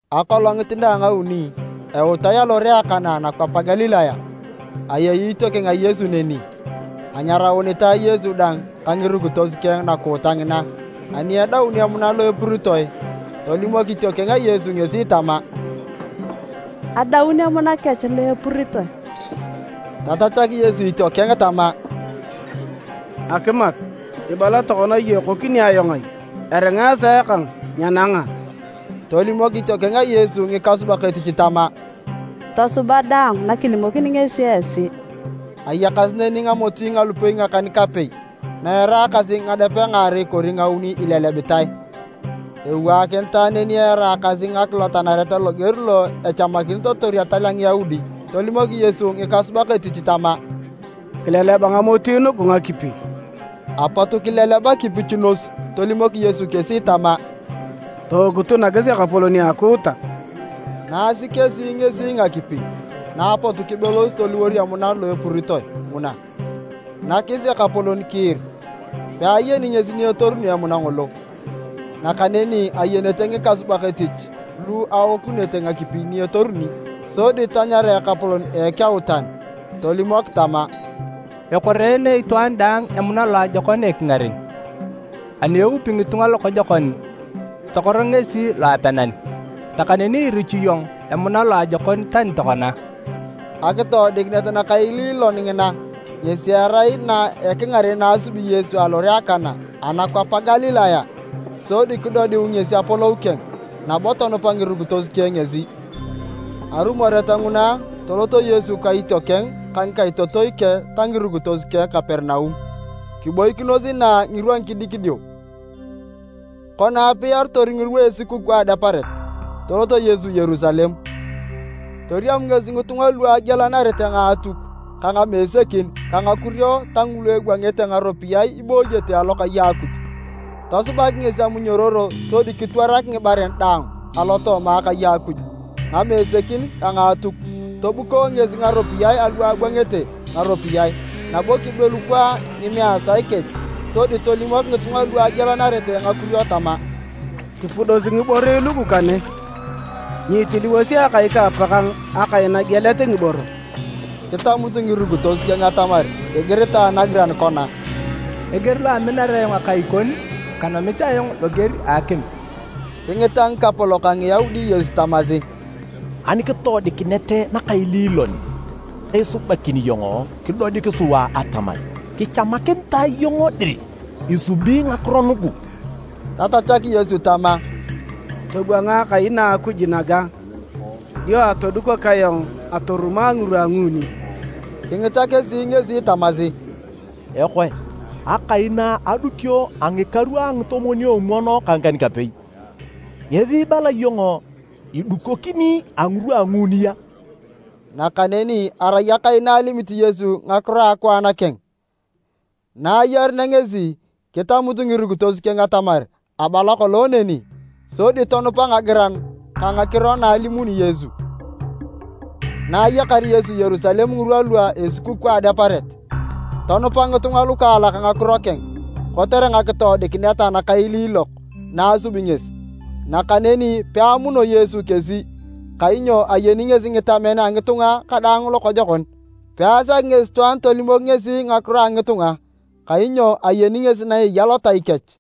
Akolongit na a ngauni, eutae alore a Kana anakwap a Galilaya. Ayei itiokeng a Yesu neni. Anyaraunitae Yesu dang ka ngirukitos keng nakuuta ngina. Ani edaun emuna lo epuritoe, tolimok itiokeng a Yesu ngesi tama, “Adaun emuna kech lo epuritoe.” Tatachak Yesu itiokeng tama, “Akimat, ibala tokona iyong ekokini ayong ai? Eringa esaa kang nyenanga.” Tolimok itiokeng a Yesu ngikasubak etich tama, “Tosuba daang na kilimokini ngesi esi.” Ayakasi neni ngamoti nalupei ngakan-kapei na eraakasi ngadepe ngaarei kori ngauni ilelebitae. Ewaakinitae neni eraakasi ngakilotanaret loger lo echamakinitor etal a Ngiyaudi. Tolimok Yesu ngikasubak etich tama, “Kileleba ngamoti nugu ngakipi.” Apot kileleba kipichunos, tolimok Yesu kesi tama, “Tookutu nakis ekapolon a akuuta.” Nasi kesi ngesi ngakipi, na apot kibelos toliwor emuna lo epuritoe nguna, nakis ekapolon kiir. Peayeni ngesi ni etoruni emuna ngolo, (nakaneni ayenete ngikasubak etich lu aokunete ngakipi ni etoruni), sodi tanyara ekapolon ekeutan, tolimok tama, “Ekoreene itwaan daang emuna loajokon ekingaren, ani eupi ngitunga lokojokon, tokor ngesi loapenan. Nakaneni irichu iyong emuna loajokon tani tokona!” Akitoodikinet nakaililon ngina ngesi erai na a ekingaren na asubi Yesu alore a Kana anakwap a Galilaya. Sodi kidodiu ngesi apolou keng, nabo tonupa ngirukitos keng ngesi. Arumoret nguna, toloto Yesu ka itiokeng, ka ngikaitotoi keng, ta ngirukitos keng Kaperinaum, kiboikinos inaa ngirwa ngidikidio. Kona aapikinitor ngirwa a esukukuu a Adeparet, tolot Yesu Yerusalem. Toriam ngesi ngitunga lu agialanarete ngaatuk, ka ngamesekin ka ngakurio ta ngulu ebwangete ngaropiyae ibooyete alokai a Akuj. Tosubak ngesi amunyororo sodi kitwarak ngibaren daang alotooma akai a Akuj, ngamesekin ka ngaatuk. Tobuko ngesi ngaropiyae alu abwangete ngaropiyae, nabo kibelukwaa ngimeesae kech. Sodi tolimok ngitunga lu agialanarete ngakurio tama, “Kipudosi ngiborei lugu kane! Nyiitiliwosi Akai ka Apakang akai nagielet ngiboro!” Kitamut ngirukitos keng atamar igiritae nagiran kona, “Eger lo aminar ayong akai kon, kanomit ayong loger a akim!” Kingita ngikapolok a Ngiyaudi Yesu tamasi, “Ani kitoodikinet nakaililon isubakini iyong kidodik sua atamar kichamakinitae iyong dir isubi ngakiro nugu?” Tatachak Yesu tama, “Tobwanga Akai na a Akuj naga dio atodukok ayong atorumo a ngirwa a nguuni.” Kingita kesi ngesi tamasi, “Ekoe! Akai na adukio a ngikaru ngitomwon-omwon ka ngikan-kapei, ngesi ibala iyong idukokini a ngirwa a nguuni a?” Nakaneni arai akai na alimit Yesu ngakiro a akwaan keng. Na ayarunea ngesi, kitamut ngirukitos keng atamar abala kolong neni, sodi tonupa ngagiran ka ngakiro na alimuni Yesu. Na ayakar Yesu Yerusalem ngirwa lua esukukuu a Adeparet, tonupa ngitunga lukaalak ngakiro keng kotere ngakitoodikinet nakailiilok na asubi ngesi. Nakaneni peamuno Yesu kesi, kainyo ayeni ngesi ngitamen a ngitunga kadaang lokojokon. Peasaki ngesi itwaan tolimok ngesi ngakiro a ngitunga, kainyo ayeni ngesi na eya lotai kech.